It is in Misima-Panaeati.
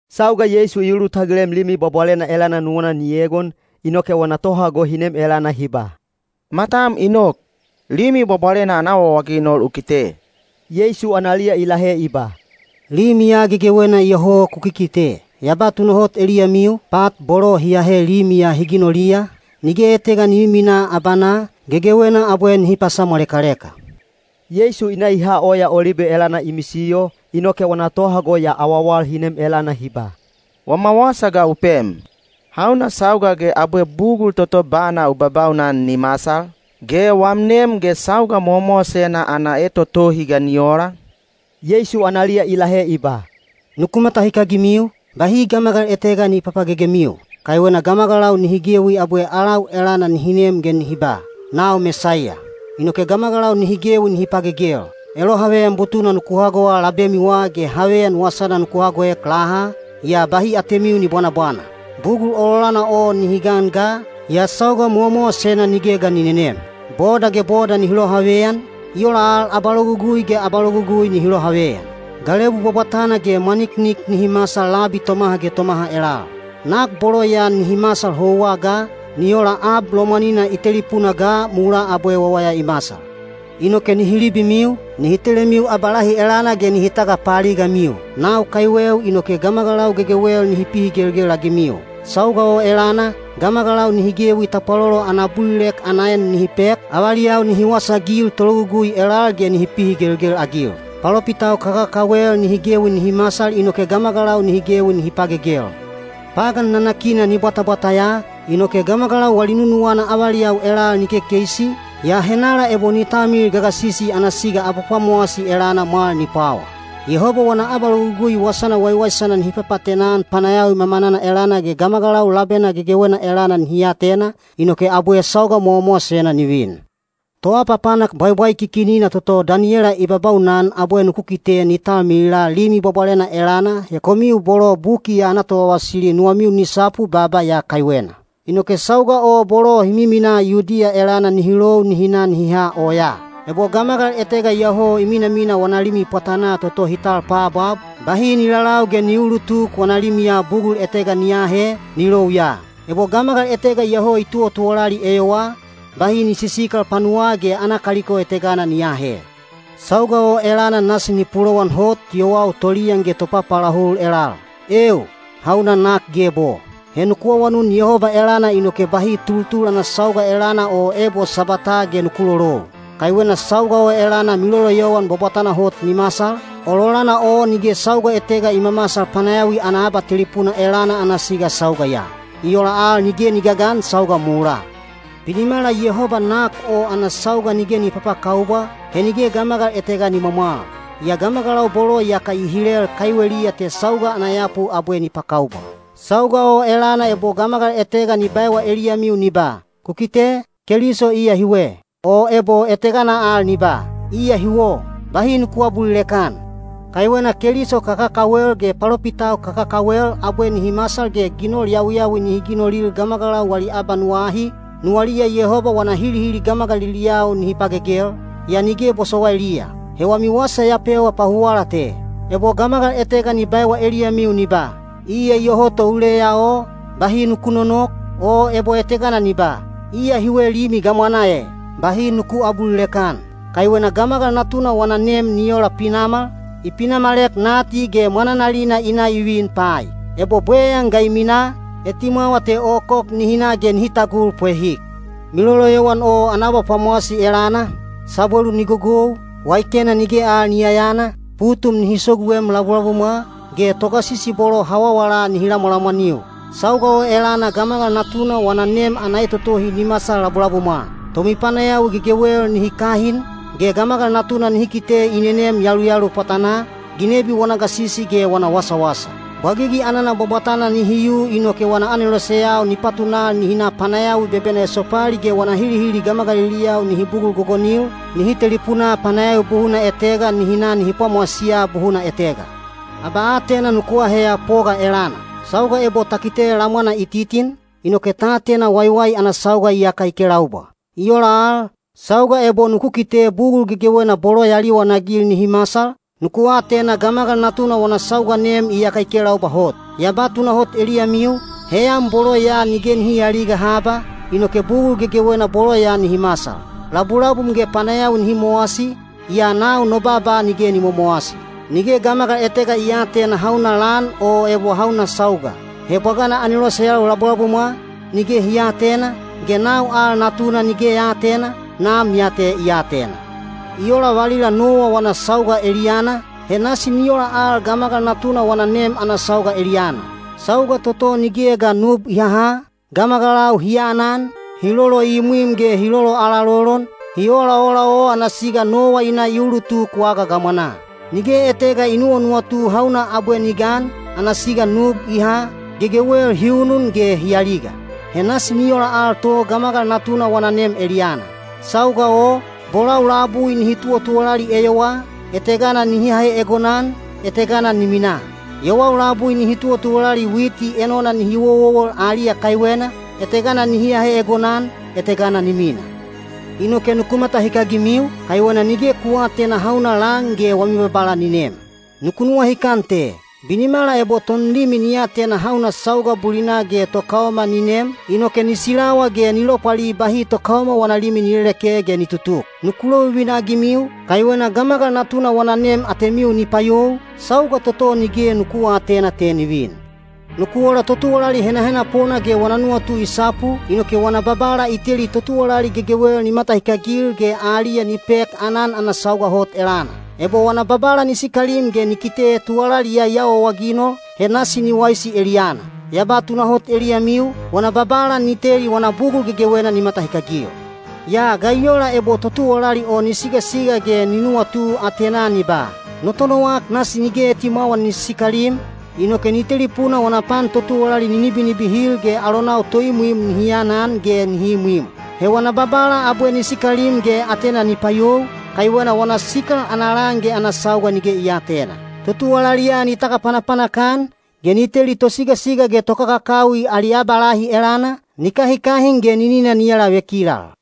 Sauga Yeisu i ulutagilem Limi Bwabwalena elana nuwana ni egon, inoke wana tohago hi nem elana hi ba, “Matam i nok, Limi Bwabwalena ana awaawaginol u kite.” Yeisu analiya i lahe i ba, “Limi ya gegewena iyoho ku kikite. Ya ba tunahot eliyamiu, pat bolo hi ahe limi ya hi ginoliya, nige etega ni miminaa abanaa, gegewena abwe nihi pasamwalekaleka.” Yeisu i na i ha Oya Olibe elana i misiyo, inoke wana tohago ya awawal hi nem elana hi ba, “Wama wasa ga u pem, hauna sauga ge abwe bugul toto bana u babaunan ni masal? Ge wam nem ge sauga mowamowasena ana etotohi ga ni ola?” Yeisu analiya i lahe i ba, “Nuku matahikagimiu, bahi gamagal etega ni papagegemiu. Kaiwena gamagalau nihi gewi abwe alau elana nihi nem ge nihi ba, ‘Nau Mesaiya!’ inoke gamagalau nihi gewi nihi pagegel. Elohaveyan butuna nuku hagowa labemiwa ge haveyan wasana nuku hagoek laha, yaa bahi atemiu ni bwanabwana. Bugul ololana o ni gan ga, yaa sauga mowamowasena nige ga ni nenem. Boda ge boda nihi lohaveyan, i ola al abalogugui ge abalogugui nihi lohaveyan. Galebu bwabwatana ge mwaniknik nihi masal labi tomaha ge tomaha elal. Nak bolo ya nihi masal houwa ga, ni ola ab lomwanina i telipuna ga mulaa abwe wawaya i masal. Inoke nihi libimiu, nihi telemiu abalahi elana ge nihi tagapaaligamiu. Nau kaiweu inoke gamagalau gegewel nihi pihigelgel-agimiu. Sauga o elana, gamagalau nihi gewi tapwalolo ana abulilek ana en nihi pek, avaliyau nihi wasaagil tologugui elal ge nihi pihigelgel-agil. Palopitau kakakawel nihi gewi nihi masal inoke gamagalau nihi gewi nihi pagegel. Pagan nanakina ni bwatabwata ya, inoke gamagalau wali nunuwana avaliyau elal ni kekeisi, yaa henala ebo ni talmilil gagasisi ana siga abapwamowasi elana mwal ni pwawa. Yehoba wana abalogugui wasana waiwaisana nihi papaatena-an panayawi mamanana elana ge gamagalau labena gegewena elana nihi atena, inoke abwe sauga mowamowasena ni vin. ‘Toapapanak bwaibwaikikinina’ toto Daniyela i babaunan abwe nuku kite ni talmilila Limi Bwabwalena elana—he komiu bolo buki ya ana tovavasili nuwamiu ni sapu baaba ya kaiwena. Inoke sauga o bolo hi miminaa Yudiya elana nihi lou nihi na nihi ha oyaa. Ebo gamagal etega iyoho i minamina wana limi pwatanaa toto hi tal paabwab, bahi ni lalau ge ni uulutuk wana limiya bugul etega ni aahe, ni lou ya. Ebo gamagal etega iyoho i tuwatuwalali eyowaa, bahi ni sisikal panuwaa ge ana kaliko etegana ni aahe. Sauga o elana nasi ni pulowan hot yowau toliyan ge topapaalahul elal. Eeu, hauna nak geb o! He nuku awanun Yehoba elana inoke bahi tultul ana sauga elana o ebo Sabwataa ge nuku lolou. Kaiwena sauga o elana miloloyowan bwabwatana hot ni masal, ololana o nige sauga etega i mamasal panayawi ana abatelipuna elana ana siga sauga ya. I ola al nige ni gagan sauga mulaa. Binimala Yehoba nak o ana sauga nige ni papakaubwa, he nige gamagal etega ni mwamwal. Yaa gamagalau bolo iyaka i hilel kaiweliya te sauga ana yapu abwe ni pakaubwa. Sauga o elana ebo gamagal etega ni baewa eliyamiu ni ba, ‘Ku kite, Keliso iya hiwe,’ o ebo etegana al ni ba, ‘Iya huwo,’ bahi nuku aabulilek-an. Kaiwena keliso kakakawel ge palopitau kakakawel abwe nihi masal ge ginol yawiyawi nihi ginolil gamagalau wali abanuwa ahi, nuwaliya Yehoba wana hilihili gamagaliliyau nihi pagegel, yaa nige bosowailiya. He wami wasa ya pewa pahuwala te. Ebo gamagal etega ni baewa eliyamiu ni ba, ‘Iya iyoho to uleya o,’ bahi nuku nonok, o ebo etegana ni ba, ‘Iya hiwe limi gamwanaa e,’ bahi nuku aabulilek-an. Kaiwena Gamagal Natuna wana nem ni ola pinamal, i pinamalek nati ge mwananalina i na i vin pai. Ebo bweyan ga i minaa, etimwawa te okok nihi na ge nihi tagul pwehik. Miloloyowan o ana abapwamowasi elana, sabwelu ni gogou, waikena nige al ni yayana, putum nihi soguem labulabumwa, ge togasisi bolo hawawala nihi lamwalamwaniu. Sauga o elana Gamagal Natuna wana nem ana etotohi ni masal labulabumwa. Tomipanayawi gegewel nihi kahin, ge Gamagal Natuna nihi kite i nenem yaluyalu pwatanaa, ginebi wana gasisi ge wana wasawasa. Bwagigi anana bwabwatana nihi yu inoke wana aneloseyau ni patunal nihi na panayawi bebena esopali ge wana hilihili gamagaliliyau nihi bugul gogonil, nihi telipunaa panayawi buhuna etega nihi na nihi pwamowasiya buhuna etega. Abaatena nuku aheya poga elana. Sauga ebo ta kite lamwana i titin, inoke ta atena waiwai ana sauga iyaka i kelaubwa. I ola al, sauga ebo nuku kite bugul gegewena bolo ya liwanagil nihi masal, nuku atena Gamagal Natuna wana sauga nem iyaka i kelaubwa hot. Ya ba tunahot eliyamiu, heyan bolo ya nige nihi aaliga haba, inoke bugul gegewena bolo ya nihi masal. Labulabum ge panayawi nihi mowasi, yaa nau no baaba nige ni momowasi. Nige gamagal etega i aatena hauna lan o ebo hauna sauga. He bwagana aneloseyau labulabumwa, nige hi aatena, ge nau al Natuna nige ya aatena, Nam ya te i atena. I ola valila Nowa wana sauga eliyana, he nasi ni ola al Gamagal Natuna wana nem ana sauga eliyana. Sauga toto nigeya ga nub i haha, gamagalau hi aanan, hi loloimwim ge hi loloalalolon, hi olaola o ana siga Nowa i na i ulutuk waga gamwanaa. Nige etega i nuwanuwatu hauna abwe ni gan, ana siga nub i ha, gegewel hi unun ge hi aliga. He nasi ni ola al to Gamagal Natuna wana nem eliyana. Sauga o, bolau labui nihi tuwatuwalali eyowaa, etegana nihi ahe egonan, etegana ni mina. Yowau labui nihi tuwalali witi enona nihi wowowol aliya kaiwena, etegana nihi ahe egonan, etegana ni mina. Inoke nuku matahikagimiu, kaiwena nige ku aatena hauna lan ge wami Babala ni nem. Nuku nuwahikan te: binimala ebo tonlimi ni atena hauna sauga bulina ge tokaoma ni nem, inoke ni silawa ge ni lopwali bahi tokaoma wana limi ni leleke ge ni tutuk. Nuku lovivina-agimiu, kaiwena Gamagal Natuna wana nem atemiu ni payou, sauga toto nige nuku aatena te ni vin. Nuku ola totuwalali henahenapona ge wana nuwatu i sapu, inoke wana babala i teli totuwalali gegewel ni matahikagil ge aliya ni pek aanan ana sauga hot elana. Ebo wana babala ni sikalim ge ni kite tuwalali ya i awaawaginol, he nasi ni waisi eliyana. Ya ba tunahot eliyamiu, wana babala ni teli wana bugul gegewena ni matahikagil. Yaa ga i ola ebo totuwalali o ni sigasiga ge ni nuwatu atenaa ni ba, ‘No tonowak nasi nige etimwawa ni sisikalim,’ inoke ni telipuna wana pan totuwalali ni nibinibihil ge alonau toimwim nihi anan ge nihi imwim. He wana babala abwe ni sikalim ge atena ni payou, kaiwena wana sikal ana lan ge ana sauga nige i aatena. Totuwalali ya ni tagapanapanak-an, ge ni teli tosigasiga ge tokakakawi ali abalahi elana, ni kahikahin ge ninina ni alavekilal.”